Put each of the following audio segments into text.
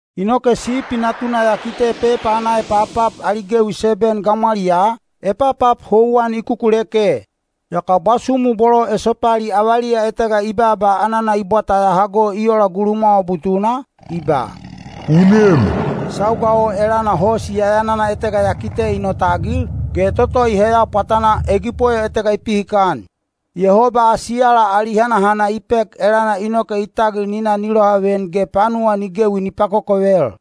Inoke Sipi Natuna ya kite pepa ana epapap ali gewi seben gamwaliyaa, epapap houwan i kukuleke. Yaka bwasumu bolo esopali avaliya etega i baaba anana i bwata ya hago i ola gulumwawa butuna, i ba, “U nem!” Sauga o elana hosi yayanana etega ya kite i notagil, ge toto i heya pwatanaa egipoyo etega i pihikan. Yehoba asiyala ali hanahana i pek elana inoke i tagil ni na ni lohaveyan ge panuwa ni gewi ni pakokovel.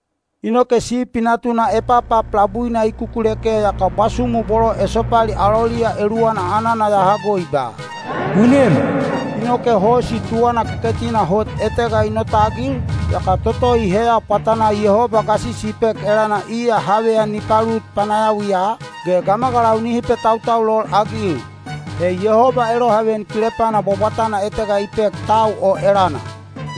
Inoke Sipi Natuna epapap labuina i kukuleke yaka bwasumu bolo esopali aloliya eluwana anana ya hago i ba, “U nem!” Inoke hosi tuwana keketina hot etega i notagil, yaka toto i heya pwatanaa Yehoba gasisi i pek elana iya haveyan ni palut panayawiya, ge gamagalau nihi petautaulol-agil. He Yehoba elohaveyan kilepana bwabwatana etega i pek tau o elana.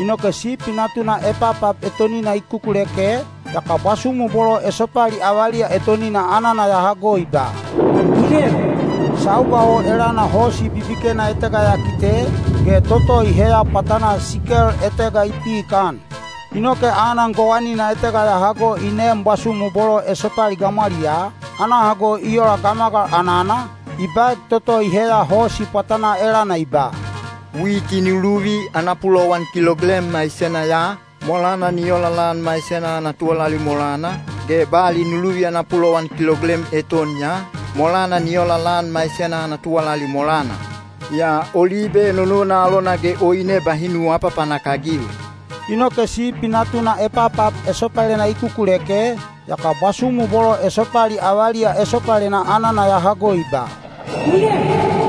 Inoke Sipi Natuna epapap etonina i kukuleke, yaka bwasumu bolo esopali avaliya etonina anana ya hago i ba, “U nem!” Sauga o elana hosi bibikena etega ya kite, ge toto i heya pwatanaa sikel etega i pihikan. Inoke anan gowanina etega ya hago i neem bwasumu bolo esopali gamwaliyaa, ana hago i ola gamagal anana, i baek toto i heya hosi pwatanaa elana i ba, “Witi nu luvi ana pulowan kiloglem maisena ya, molana ni ola lan maisena ana tuwalali molana, ge bali nu luvi ana pulowan kiloglem eton ya, molana ni ola lan maisena ana tuwalali molana. Yaa olibe enonona alona ge oine bahi nu aapapanak-agil.” Inoke Sipi Natuna epapap esopalena i kukuleke, yaka bwasumu bolo esopali avaliya esopalena anana ya hago i ba, “U nem!”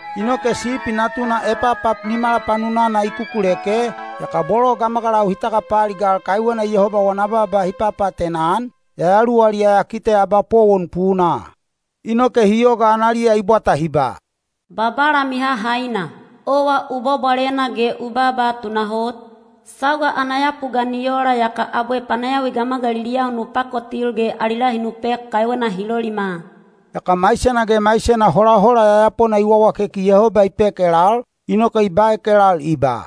Inoke Sipi Natuna epapap nimala panunana i kukuleke, yaka bolo gamagalau hi tagapaaligal kaiwena Yehoba wana baaba hi papaatena-an, yayaluwaliya ya kite abapowon punaa. Inoke hi yoga analiya i bwata hi ba, “Babala Mihahaina, owa u bwabwalena ge u baaba tunahot, sauga ana yapu ga ni ola yaka abwe panayawi gamagaliliyau nu pakotil ge ali lahi nu pek kaiwena hi lolima?” Yaka maisena ge maisena holahola yayapona i wawakeki Yehoba i pek elal, inoke i baek elal i ba,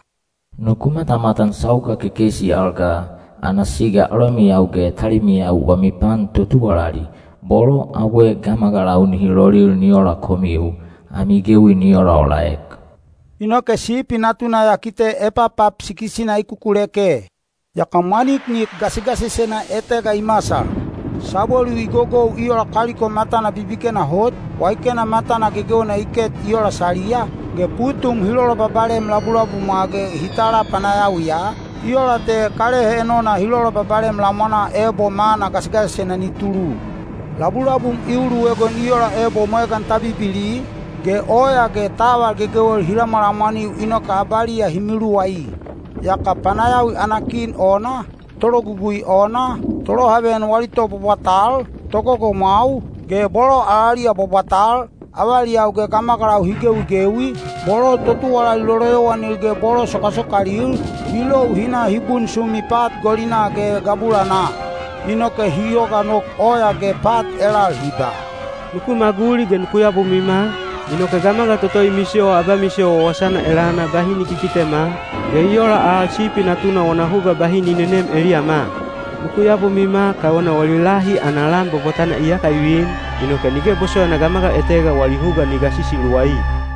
“Nuku matamatan sauga kekeisi al ga, ana siga alomiyau ge talimiyau wami pan totuwalali, bolo abwe gamagalau nihi lolil ni ola komiu, ami gewi ni olaolaek.” Inoke Sipi Natuna ya kite epapap sikis-ina i kukuleke. Yaka mwaniknik gasigasisena etega i masal. Sabwelu i gogou i ola kaliko matana bibikena hot, waikena matana gegewena i ket i ola saliya, ge putum hi lolobabalem labulabumwa ge hi tala panayawiya, i ola te kalehe enona hi lolobabalem lamwanaa ebo mana gasigasisena ni tulu. Labulabum i uluegon i ola ebo mwegan ta bibili, ge oya ge taval gegewel hi lamwalamwaniu inoke abaliya hi miluwai. Yaka panayawi ana kin ona, tologugui ona, tolohaveyan wali tobwabwatal, togogomwau, ge bolo alaliya bwabwatal, avaliyau ge gamagalau hi gewigewi, bolo totuwalali loloyowanil ge bolo sokasokalil, hi lou hi na hi bunsumi pat golinaa ge gabulanaa. Inoke hi yoga nok oya ge pat elal hi ba, “Nuku maguli ge nuku yabomwima, inoke gamagal toto i misiyowa abamisiyo wawasana elana bahi ni kikitema, ge i ola al Sipi Natuna wana huga bahi ni nenem eliyama. Nuku yabomwima kaiwena wali lahi ana lan bwabwatana iyaka i vin, inoke nige bosowaina gamagal etega wali huga ni gasisi luwai.”